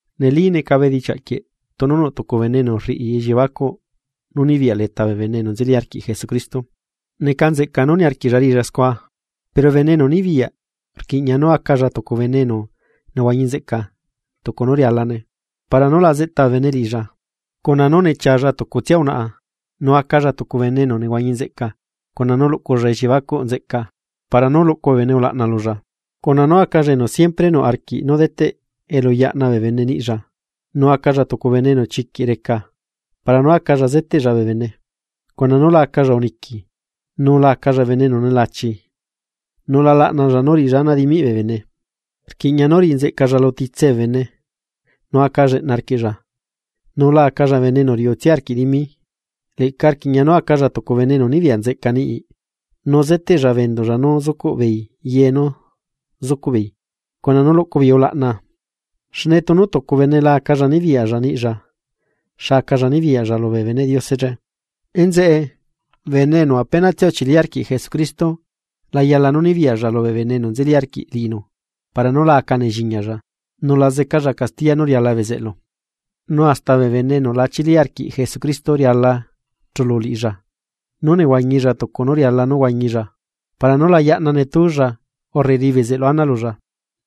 Neli, neca bedichiaꞌ quieꞌ tunu nuꞌ tucu bene enu rriꞌi elliebacuꞌ nú nibiyaꞌ leta bee bene enu nzeli arquiꞌ Jesucristo, neca nzeꞌca nú niarquiꞌlla riꞌilla scua. Pero bene enu nibiyaꞌ rquiꞌña nú acalla tucu bene enu nehuañi nzeꞌca tucu nú rialane para nú la zeꞌta bee bene liꞌilla, cuna nú nechialla tucutsia unaꞌa, nu acalla tucu bene enu nehuañi nzeꞌca cuna nú luꞌculla elliebacuꞌ nzeꞌca para nú luꞌcu bee bene ulaꞌna lulla, cuna nú acalla enu siempre nuꞌ arquiꞌ nú deteꞌ elu yaꞌna bee bene niꞌlla, nu acalla tucu bene enu chiquiꞌ reca para nú acalla zeteꞌlla bee bene. Cuna nú la acalla uniqui nu la acalla bene enu nelachi, nu la laꞌnalla nú riꞌilla ana dimiꞌ bee bene, rquiꞌña nú riꞌi nzeꞌcalla lu titse bee bene, nu aca lleꞌna arquiꞌlla, nu la acalla bene enu riuꞌtsia arquiꞌ dimi. Leꞌca rquiꞌña nú acalla tucu bene enu nibiyaꞌ nzeꞌca niꞌi, nu zeteꞌlla bee enduꞌlla nú zucuꞌ beei ye nú zucuꞌ beei cuna nú luꞌcu beei ulaꞌna. Xne tunu tucu bene la acalla nibiyaꞌlla niꞌlla, ¿xa acalla nibiyaꞌlla lubee beneꞌ Diose che? Enzeꞌe, bene enu apenatsia nzeli arquiꞌ Jesucristo, la yala nu nibiyaꞌlla lubee bene enu nzeli arquiꞌ liꞌinu para nú la aca nelliñalla nu la zecalla castiya nú riala bezeꞌlu. Nu hasta bee bene enu la chili arquiꞌ Jesucristo riala chulu liꞌilla nú nehuañilla tucu nú riala nú huañilla para nú la yaꞌna netúlla urre riꞌi bezeꞌlu ana lulla.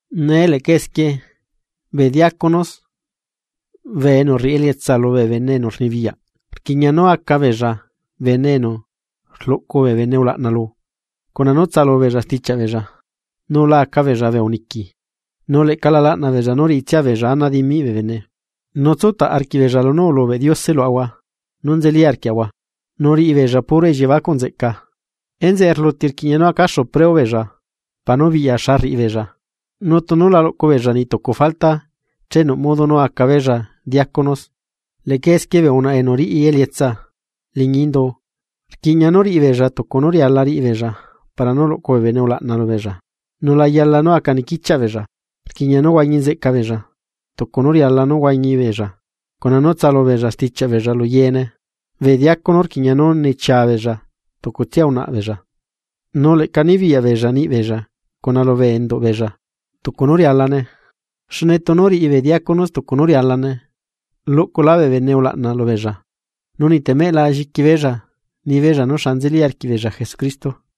Nee leꞌca esquie, bee diácono bee enu rriꞌi elietsa lu bene enu rnibiyaꞌ rquiꞌña nú aca beella bene enu rluꞌcu bee bene ulaꞌna lu, cuna nú tsaꞌalu beella stichiaꞌ beella, nu la aca beella bee uniqui, nu leꞌca la laꞌna beella nú riꞌitsia beella ana dimiꞌ bee bene. Nu tsutaꞌ arquiꞌbeella lunú ulubeꞌ Diose luaꞌahua nú nzeli arquiaꞌahua, nu riꞌibeella puro elliebacuꞌ nzeꞌca. Enzeꞌe rluti rquiꞌña nú acaxu preo beella, para nú biꞌya xa rriꞌi beella, nu tunu la luꞌcu beella niꞌ tucu falta che nuꞌ modo nú aca beella diácono. Leꞌca esquie bee unaꞌa enu riꞌi elietsa liñi indu, rquiꞌña nú riꞌi beella tucu nú riala riꞌi beella para nú luꞌcu bee bene ulaꞌna lubeella nu la yala nú aca niquichiaꞌ beella, rquiꞌña nú huañi nzeꞌca beella, tucu nú riala nú huañi beella, cuna nú tsaꞌalu beella stichiaꞌ beella lu yeene. Bee diácono rquiꞌña nú nechia beella tucutsia unaꞌa beella, nu leꞌca nibiyaꞌ beella niꞌi beella cuna lubee enduꞌ beella tucu nú rialane. Xne tunu riꞌi bee diácono tucu nú rialane, luꞌculá bee bene ulaꞌna lubeella, nu niꞌtemeꞌ la lliqui beella nibeella nú xa nzeli arquiꞌbeella Jesucristo.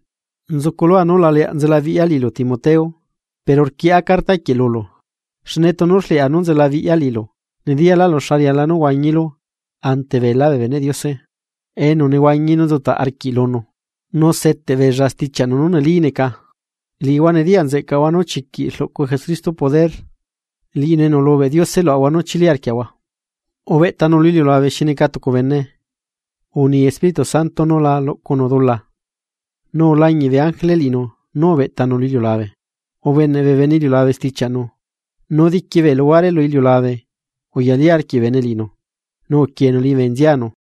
Nzuculua nú la leaꞌ nzelabiꞌya liꞌilu Timoteo, pero rquieꞌa carta quieꞌ lulu, xne tunu rleꞌa nú nzelabiꞌya liꞌilu, nediyaꞌlaꞌlu xa riala nú huañilu ante beelá bee beneꞌ Diose, enu nehuañi nu nzutaꞌ arquiꞌ lunu, nu seteꞌbeella stichiaꞌnu nú neli neca. Liꞌihua nediyaꞌnzeꞌcaꞌahua nú chiquiꞌ rluꞌcu Jesucristo poder liꞌinu enu ulubeꞌ Diose luaꞌahua nú chili arquiaꞌahua: Ubeꞌtanu lu iliulabe xi neca tucu bene, uni Espíritu Santo nú la luꞌcunu dula, nu ulañiꞌ bee ángele liꞌinu nú ubeꞌtanu lu iliulabe. Ubeneꞌ bee bene iliulabe stichiaꞌnu, nu diqui bee luhuare lu iliulabe uyali arquiꞌ bee bene liꞌinu, nu uquienu liñibe nzianu.